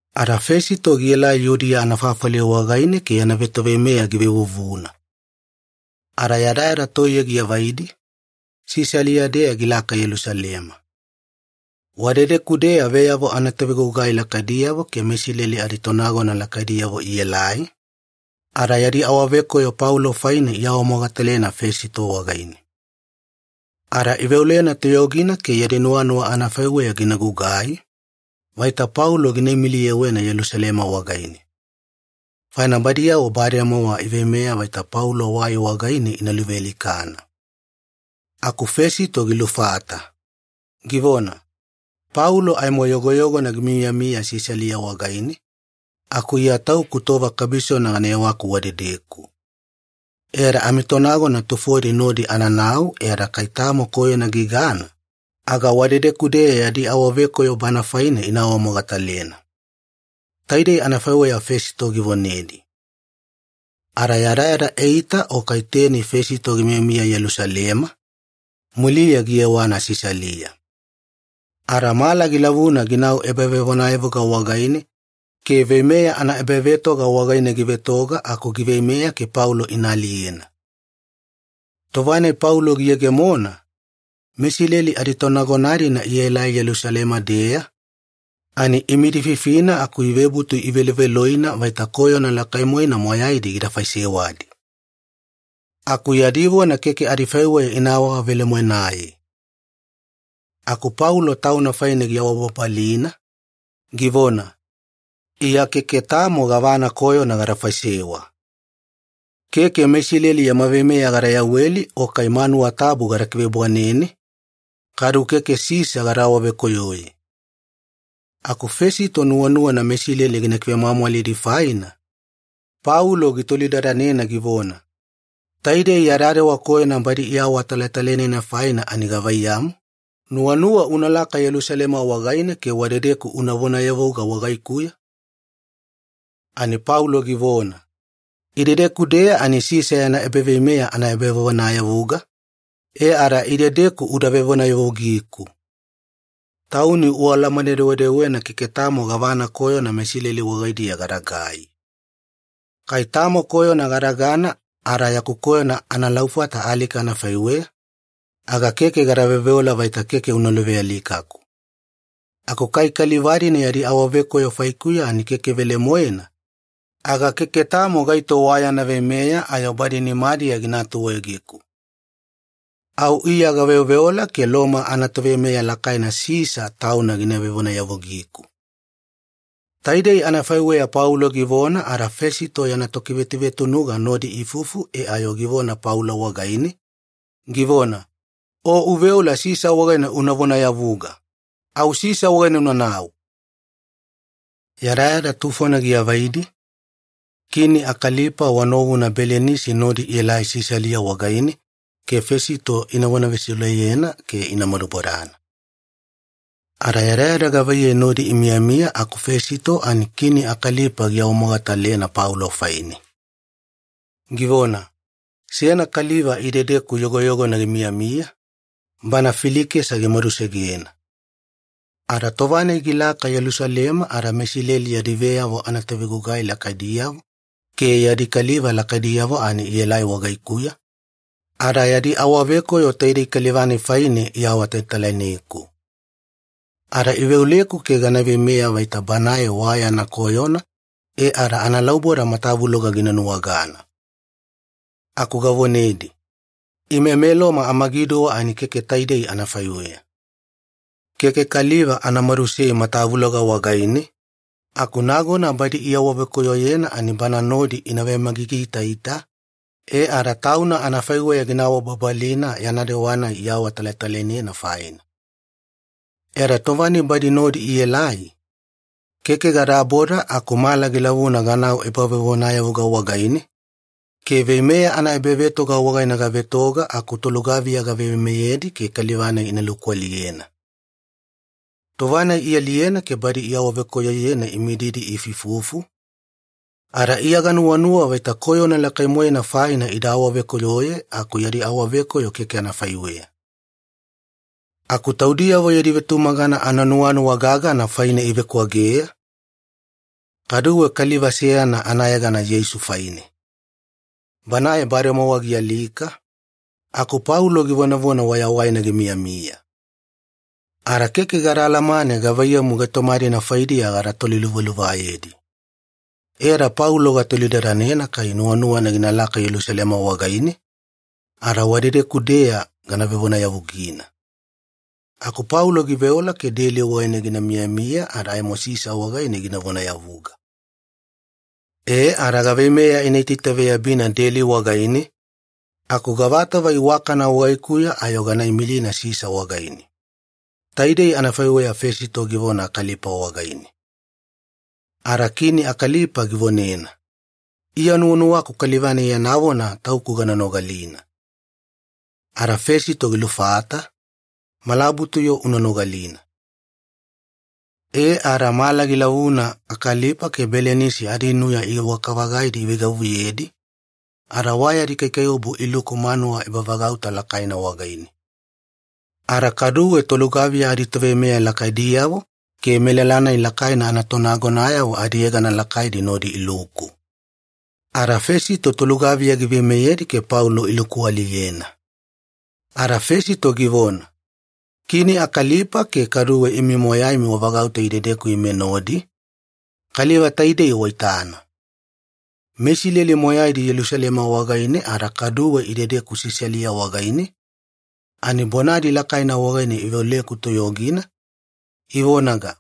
Ada Fesito gielai Yudiya anafafali wagaine ke yana vetoveimeya givevuvuna. Ada yadayada toiye giavaidi, Sisalia-deya gilaka Yelusalema. Wadedeku-deya veyavo anatovegugai lakaidiyavo ke meIsileli aditonagona lakaidiyavo ielai, ada yadi awavekoyo Paulo faine iawamogatalena Fesito wagaine. Ada iveolena toyogina ke yadi nuwanuwa anafaiweya gina gugai, vaita Paulo gina imiliyewena Yelusalema wagaine. Faina badi bademowa iveimeya vaita Paulo wai wagaine ina luvealikana. Aku Fesito gilufata, givona, “Paulo aimo yogoyogona gimiyamiya Sisalia wagaine, aku Iya tauku tova kabisona gana yewaku wadedeku. E ada amitonagona tufodi nodi ananau e ada kai tamo koyona gigana, aga wadedeku-deya yadi awavekoyo bana faine ina awamogatalena.” Taidei anafaiweya Fesito givonedi. Ada yadayada eita o kai teni Fesito gimiyamiya Yelusalema, muliya giyewana Sisalia. Ada mala gilavuna ginau ebavevonayavuga wagaine ke veimeya anaebavetoga wagaine givetoga aku giveimeya ke Paulo ina aliyena. Tova-nai Paulo giyegemona, meIsileli aditonagona-dina ielai Yelusalema-deya, ani imidififina aku ivebutu iveloveloina vaita koyona lakai-moena moyaidi gida faisewadi. Aku yadi vona keke adifaiweya ina awavelemoenaye. Aku Paulo tauna faine giawabababalina, givona, “Iya keke tamo gavana koyona gada faisewa. Keke meIsileli yama veimeya gada yaweli o kai manuwa tabu gada kivebwanene, kadu keke Sisa gada awavekoyoye.” Aku Fesito nuwanuwana meIsileli gina kivemwamwalidi faina, Paulo gitolidadanena givona, “Taidei ya dewa koyona badi iawatalatalainena faina ani gavaiyamu, nuwanuwa unalaka Yelusalema wagaine ke wadedeku una vonayavuga wagaikuya?” Ani Paulo givona, “Idedeku-deya ani Sisa yana ebaveimeya ana ebavevonayavuga, e ada idedeku uda vevonayavugiku. Tauni ualamane-dewedewena keke tamo gavana koyona meIsileli wagaidiya gadagai. Kai tamo koyona gadagana ada yaku koyona analaufata alika anafaiweya, aga keke gada veoveola vaita keke ina luvealikaku. Aku kai kaliva-dina yadi awavekoyo faikuya ani keke velemoena, aga keke tamo gaito wa yana veimeya ayo badi nimadiya gina atuegeku. Au Iya gaveoveola ke Loma anatoveimeya lakaina Sisa tauna gina vevonayavugiku.” Taidei anafaiweya Paulo givona ada Fesito yana tokivetuvetunuga nodi iifufu e ayo givona Paulo wagaine, givona, “O uveola Sisa wagaine una vonayavuga. Au Sisa wagaine unanau!” Yadayada tufona giavaidi, Kini Akalipa wa novuna Belinisi nodi ielai Sisalia wagaine ke Fesito ina vonavesiuleyena ke ina madubodana. Ada yadayada gavaiyei nodi imiyamiya aku Fesito ani Kini Akalipa giawamogatalena Paulo faine. Givona, “Seyana kaliva idedeku yogoyogona gimiyamiya, bana Filikesa gimadusegena. Ada tova-nai galaka Yelusalema ada meIsileli yadi veyavo anatovegugai lakaidiyavo ke yadi kaliva lakaidiyavo ani ielai wagaikuya, ada yadi awavekoyo taidei kaliva-nai faine iawatalatalaineku. Ada iveoleku ke gana veimeya vaita banae wa yana koyona e ada analauboda matavuloga gina nuwagana. Aku gavonedi, ‘Ime meLoma amagiduwa ani keke taidei anafaiweya. Keke kaliva ana madusei matavuloga wagaine, aku nagona badi iawavekoyoyena ani bana nodi ina vemagigiitaita, e ada tauna anafaiweya gina awababalina yana dewa-nai iawatalatalainena faina.’ E ada tova-nai badi nodi aelai, keke gadaboda aku mala gilavuna ganau ebavevonayavuga wagaine, ke veimeya anaebavetoga wagaine gavetoga aku tolugaviya gaveimeyedi ke kaliva-nai ina lukualiyena. Tova-nai ialiyena ke badi iawavekoyoyena imididi iifuifufu, ada Iya ganuwanuwa vaita koyona lakai-moena faina ida awavekoyoye aku yadi awavekoyo keke anafaiweya. Aku taudiyavo yadi vetumagana ananuwanuwa gagana faine ivekwageya, kaduwe kaliva seyana anayegana Yeisu faine. Banae bademowa gialika, aku Paulo givonavona wayawaina gimiyamiya. Ada keke gada alamane gavaiyamu gaitoma-dina faidiya gada toliluvaluvayedi. E ada Paulo gatolidadanena kai nuwanuwana ginalaka Yelusalema wagaine, ada wadedeku-deya gana vevonayavugina. Aku Paulo giveola ke deli wagaine gina miyamiya ada aimo Sisa wagaine gina vonayavuga. E ada gaveimeya ina itaitaveyabina deli wagaine, aku gavatova iwakana wagaikuya ayo gana imilina Sisa wagaine.” Taidei anafaiweya Fesito givona Akalipa wagaine. Ada Kini Akalipa givonena, “Iya nuwanuwaku kaliva-nai yana vona tauku gana nogalina.” Ada Fesito gilufata, “Malabutu-yo una nogalina.” E ada mala gilavuna Akalipa ke Belinisi adinuya iwaka-vagaidi iveigavuyedi, ada wa yadi kaikaiwabu iluku manuwa ebavagauta lakaina wagaine. Ada kaduwe tolugaviya aditoveimeya lakaidiyavo ke melala-nai lakaina anatonagonayavo adiyegana lakaidi nodi iluku. Ada Fesito tolugaviya giveimeyedi ke Paulo ilukualiyena. Ada Fesito givona, “Kini Akalipa ke kaduwe imi moyaimi wavagauta idedeku ime nodi, kaliva taidei waitana. MeIsileli moyaidi Yelusalema wagaine ada kaduwe idedeku Sisalia wagaine, ani bonadi lakaina wagaine iveoleku toyogina, ivonaga,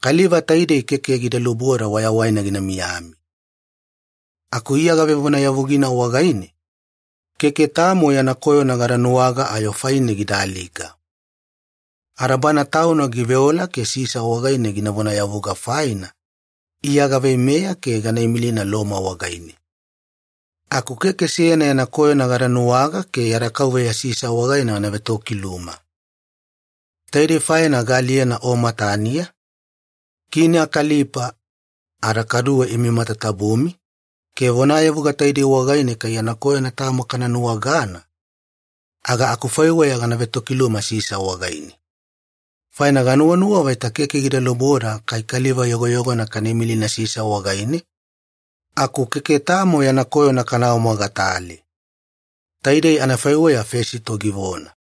‘Kaliva taidei keke gida luboda wayawaina gina miyami!’ Aku Iya gavevonayavugina wagaine, keke tamo yana koyona gada nuwaga ayo faine gida alika. Ada bana tauna giveola ke Sisa wagaine gina vonayavuga faina, Iya gaveimeya ke gana imilina Loma wagaine. Aku keke seyana yana koyona gada nuwaga ke yada kauveya Sisa wagaine gana vetokiluma. Taidei faina gaaliyena o mataniya, Kini Akalipa, ada kaduwe imi matatabumi, ke vonayavuga taidei wagaine kai yana koyona tamo kana nuwagana, aga akufaiweya gana vetokiluma Sisa wagaine. Faina ganuwanuwa vaita keke gida luboda kai kaliva yogoyogona kana imilina Sisa wagaine, aku keke tamo yana koyona kana awamogatale.” Taidei anafaiweya Fesito givona.